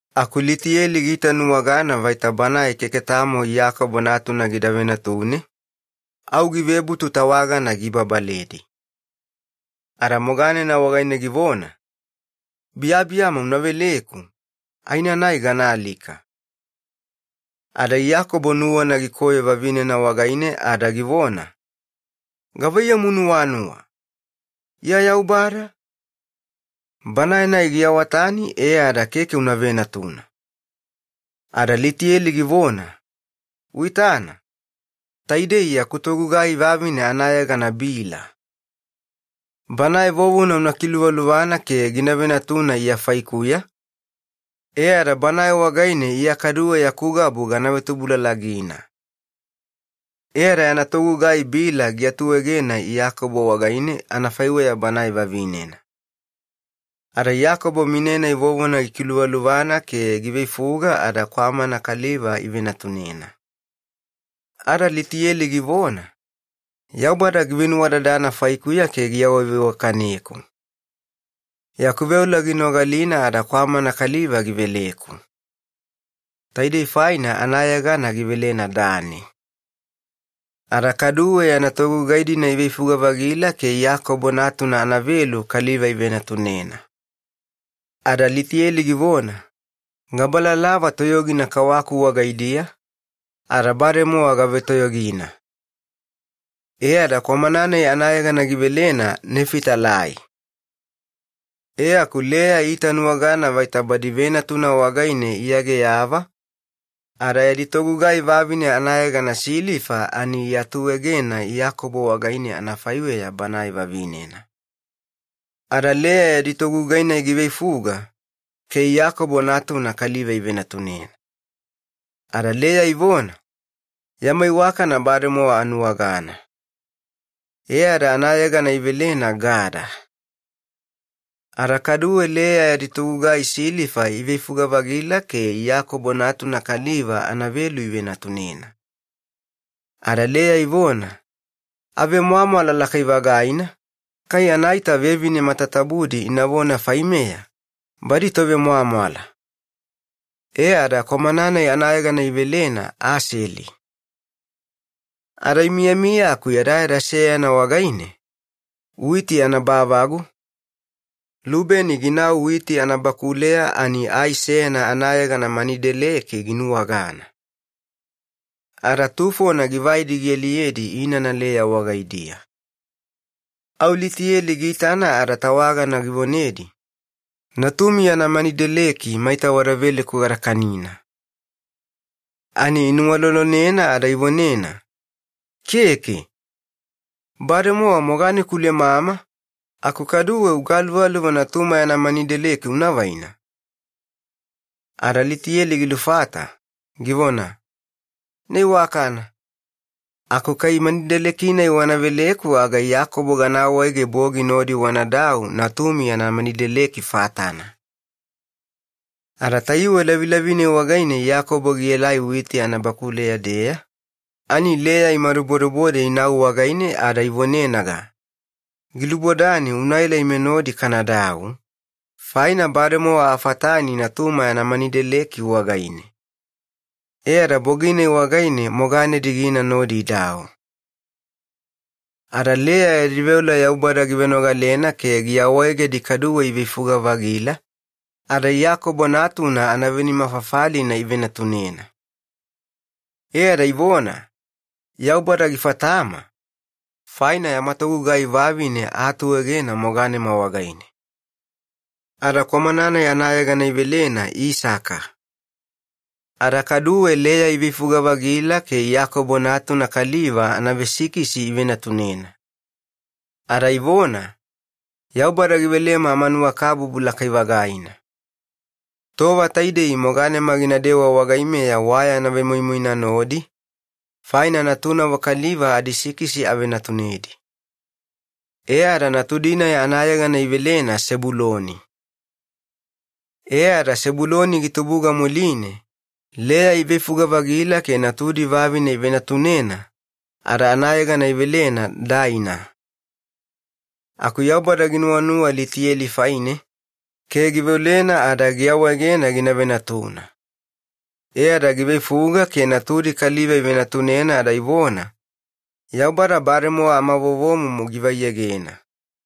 Aku Litiyeli giitanuwagana vaita banae keke tamo Iyakobo natuna gida venatune, au givebutu tawagana giibabaledi. Ada moganena wagaine givona, “Biyabiyama una veleku, aenanai ganaalika.” Ada Iyakobo nuwana gikoyo vavinena wagaine ada givona, “Gavaiyamu, iya Yaubada anafaiweya, e ada gaawatani keke una venatuna?” Ada Litiyeli givona, “Uitana, taidei yaku togugai vavine anayegana Bila. Banae vovona una kiluvaluvana ke gina venatuna iya faikuya, e ada banae wagaine iya kaduwe yaku gabu gana vetubulalagina.” E ada yana togugai Bila giatuegena Iyakobo wagaine anafaiweya banae vavinena. Ada Iyakobo mine-nai vovona gikiluvaluvana ke giveifuga ada kwamana kaliva ivenatunena. Ada Litiyeli givona, “Yaubada givenuwadadana faikuya ke giawaveiwakaneku. Yaku veola ginogalina ada kwamana kaliva giveleku.” Taidei faina anayegana givelena Dani. Ada kaduwe yana togugai-dina iveifuga-vagila ke Iyakobo natuna anavelu kaliva ivenatunena. Ada Litiyeli givona, “Gabalalava toyogina kawaku wagaidiya, ada bademowa gavetoyogina.” E ada kwamana-nai anayegana givelena Nefitalai. E aku Leya iitanuwagana vaita badi venatuna wagaine iageyava, ada yadi togugai vavine anayegana Silifa ani iatuegena Iyakobo wagaine anafaiweya banae vavinena. Ada Leya yadi togugai-nai giveifuga, ke Iyakobo natuna kaliva ivenatunena. Ada Leya ivona, “Yama iwakana bademowa anuwagana.” E ada anayegana ivelena Gada. Ada kaduwe Leya yadi togugai Silifa iveifuga-vagila ke Iyakobo natuna kaliva anavelu ivenatunena. Ada Leya ivona, “Avemwamwala lakai-vagaina, kai anaita vevine matatabudi inavona faimeya, ‘Badi tovemwamwala.’” E ada kwamana-nai anayegana ivelena Aseli. Ada imiyamiya aku yadayada seyana wagaine, witi anabavagu, Lubeni ginau witi anabakuleya ani ai seyana anayegana manideleki ginuwagana. Ada tufona givaidi gialiyedi inana Leya wagaidiya. Au Litiyeli giitana ada tawagana givonedi, “Natumi yana manideleki maita wada veleku gada kanina.” Ani inuwalolonena ada ivonena, “Keke! Bademowa moganeku ulemama, aku kaduwe ugaluvaluva natuma yana manideleki unavaina?” Ada Litiyeli gilufata, givona, “Ina iwakana, aku kai manideleki-nai wana veleku aga Iyakobo gana awaege bogi nodi wanadau natumi yana manideleki fatana.” Ada tayuwe lavilavi-nai wagaine Iyakobo gielaelai witi anabakuleya-deya, ani Leya imadubodebode inau wagaine ada ivonenaga, “Gilubodani unaela ime nodi kanadau, faina bademowa afatani natuma yana manideleki wagaine.” E ada bogi-nai wagaine moganedi gina nodi idau. Ada Leya yadi veola Yaubada givenogalena ke giawaegedi kaduwe iveifuga-vagila, ada Iyakobo natuna anavenima fafalina ivenatunena. E ada ivona, “Yaubada gifatama, faina yama togugai vavine aatuegena moganema wagaine.” Ada kwamana-nai anayegana ivelena Isaka. Ada kaduwe Leya iveifuga-vagila ke Iyakobo natuna kaliva anavesikisi ivenatunena. Ada ivona, “Yaubada givelema amanuwakabubu lakai-vagaina. Tova taidei moganema ginadewa wagaimeya wayana vemoimoina nodi, faina natunavo kaliva adisikisi avenatunedi.” E ada natudi-nai anayegana ivelena Sebuloni. E ada Sebuloni gitubuga muline, Leya iveifuga-vagila ke natudi vavine ivenatunena, ada anayegana ivelena Daina. Aku Yaubada ginuwanuwa Litiyeli faine, ke givenogalena ada giawaegena gina venatuna. E ada giveifuga ke natudi kaliva ivenatunena ada ivona, “Yaubada bademowa amavovomumu givaiegena.”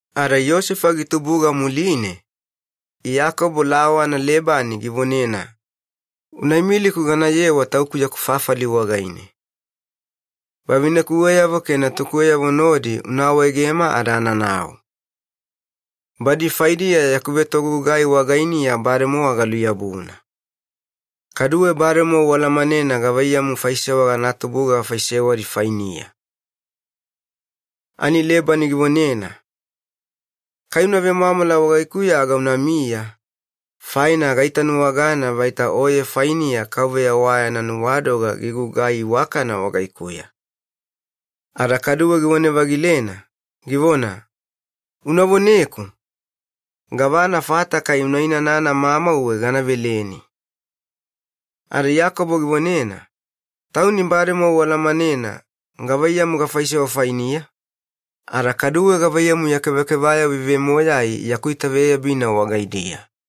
Ada Yosefa gitubuga muline, Iyakobo lawana Lebani givonena, “Unaimiliku ganayewa tauku yaku fafali wagaine. Vavinekuweyavo ke natukuweyavo nodi una awaegema ada ananau. Badi faidiya yaku vetogugai wagainiya bademowa galuyabuna. Kaduwe bademowa ualamanena gavaiyamu faisewa anatubuga gafaisewadi fainiya.” Ani Lebani givonena, “Kai uvemwamwala wagaikuya aga unamiya, faina gaitanuwagana vaita Yaubada gilemelemeku vuvuna oye wagainiya.” Ada kaduwe givone-vagilena, givona, “Unavoneku, gavana fata kai unainana mamauwe gana veleni.” Ada Iyakobo givonena, “Tauni bademowa ualamanena gavaiyamu gafaisewa fainiya, ada kaduwe gavaiyamu ya kevakevayavo ivemoyai yaku itaveyabina wagaidiya.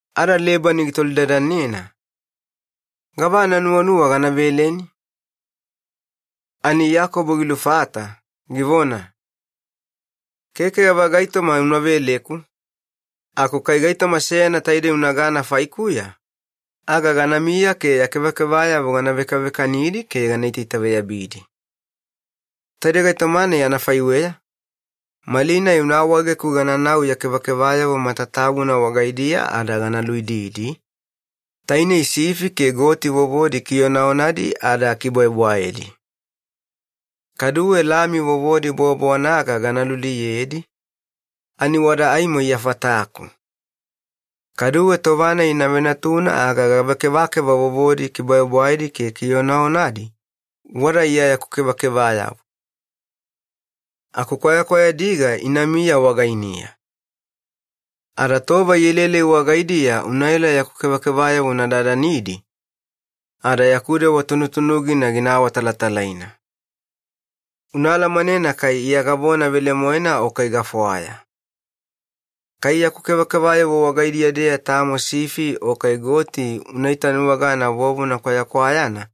Ada Lebani gitolidadanena, “Gavana nuwanuwa gana veleni?” Ani Iyakobo gilufata, givona, “Keke gava gaitoma una veleku, aku kai gaitoma seyana taidei unagana faikuya, aga ganamiya ke ya kevakevayavo gana vekavekanidi ke gana itaitaveyabidi. Taidei gaitoma-nai anafaiweya, malinai una awaegeku gananau ya kevakevayavo matatabuna wagaidiya ada gana luididi, tainei sifi ke goti vovodi kionaonadi ada bwaebwaedi. Kaduwe lami vovodi bowabowanaga gana luliyedi, ani wada aimo iya fataku. Kaduwe tova-nai ina venatuna aga gava kevakeva vovodi bwaebwaedi ke kionaonadi, wada iya yaku kevakevayavo. Aku kwayakwayadiga inamiya wagainiya. Ada tova ielaelai wagaidiya unaela yaku kevakevayavo una dadanidi, ada yaku dewa tunutunugina gina awatalatalaina. Una alamanena kai iya gavona velemoena o kai gafwaya. Kai yaku kevakevayavo wagaidiya-deya tamo sifi o kai goti una itanuwagana vovona kwayakwayana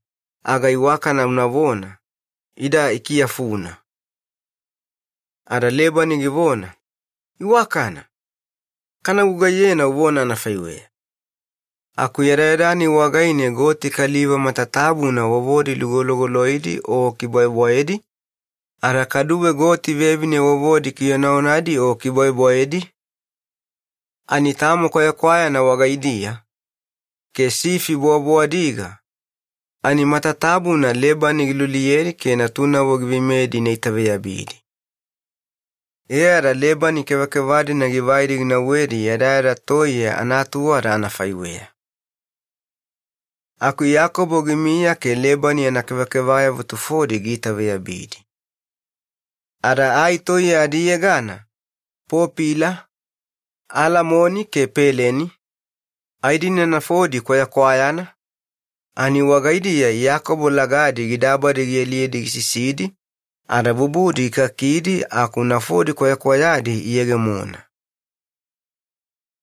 aga iwakana unavona, ‘Ida ikiyafuna.’” Ada Lebani givona, “Iwakana! Kana gugaiyena uvona anafaiweya.” Aku yadayada-nai wagaine goti kaliva matatabuna vovodi lugologoloidi o bwaebwaedi, ada kaduwe goti vevine vovodi kionaonadi o bwaebwaedi, ani tamo kwayakwayana wagaidiya, ke sifi bowabowadiga, ani matatabuna Lebani giluliyedi ke natunavo giveimeyedi ina itaveyabidi. E ada Lebani kevakeva-dina givaidi ginauwedi yadayada toiye anaatuwada anafaiweya. Aku Iyakobo gimiya ke Lebani yana kevakevayavo tufodi giitaveyabidi. Ada ai toiye adiyegana popila, alamoni ke peleni, ai-dina nafodi kwayakwayana, ani wagaidiya Iyakobo lagadi gidabadi gialiyedi gisisidi ada kwafilidi gikakidi aku nafodi kwayakwayadi iyegemona.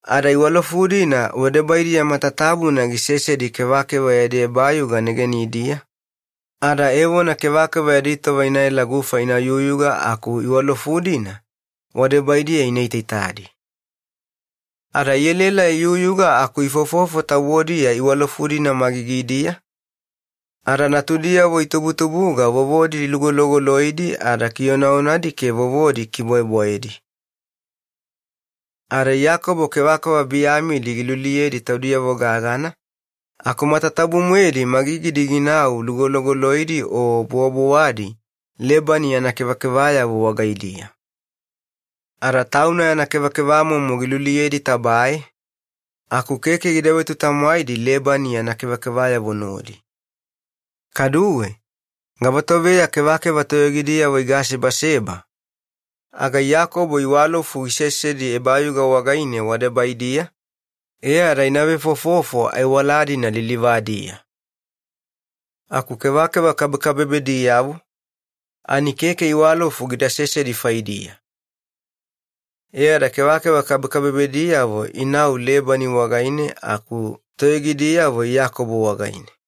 Ada iwalofu-dina wadebaidiya matatabuna gisesedi kevakeva yadi ebayuga negenidiya, ada evona kevakeva yadi tova ina elaela gufa ina yuyuga aku iwalofu-dina wadebaidiya ina itaitadi. Ada ielaela iyuyuga aku ivefofofo tabodiya iwalofu-dina magigidiya, ada natudiyavo itubutubuga vovodi lugologoloidi ada kionaonadi ke vovodi bwaebwaedi. Ada Iyakobo kevakeva biyamidi giluliyedi taudiyavo gagana, aku matatabu-moedi magigidi ginau lugologoloidi o bowabowadi Lebani yana kevakevayavo wagaidiya. Ada tauna yana kevakevamomo giluliyedi tabae, aku keke gida vetutamwaidi Lebani yana kevakevayavo nodi. Kaduwe, kai tova-nai kevakeva toyogidiyavo igasebaseba, aga Iyakobo iwalofu gisesedi ebayuga wagaine wadebaidiya, ke inavefofofo aiwala-dina lilivadiya. Aku kevakeva kabekabebediyavo, ani keke iwalofu gida sesedi faidiya. E ada kevakeva kabekabebediyavo inau Lebani wagaine aku toyogidiyavo Iyakobo wagaine.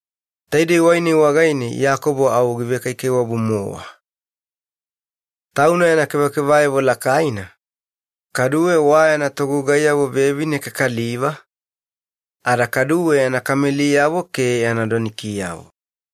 Taidei wai-nai wagaine Iyakobo au givekaikaiwabu-mowa. Tauna yana kevakevayavo lakaina, kaduwe wa yana togugaiyavo vevine ke kaliva, ada kaduwe yana kameliyavo ke yana donikiyavo.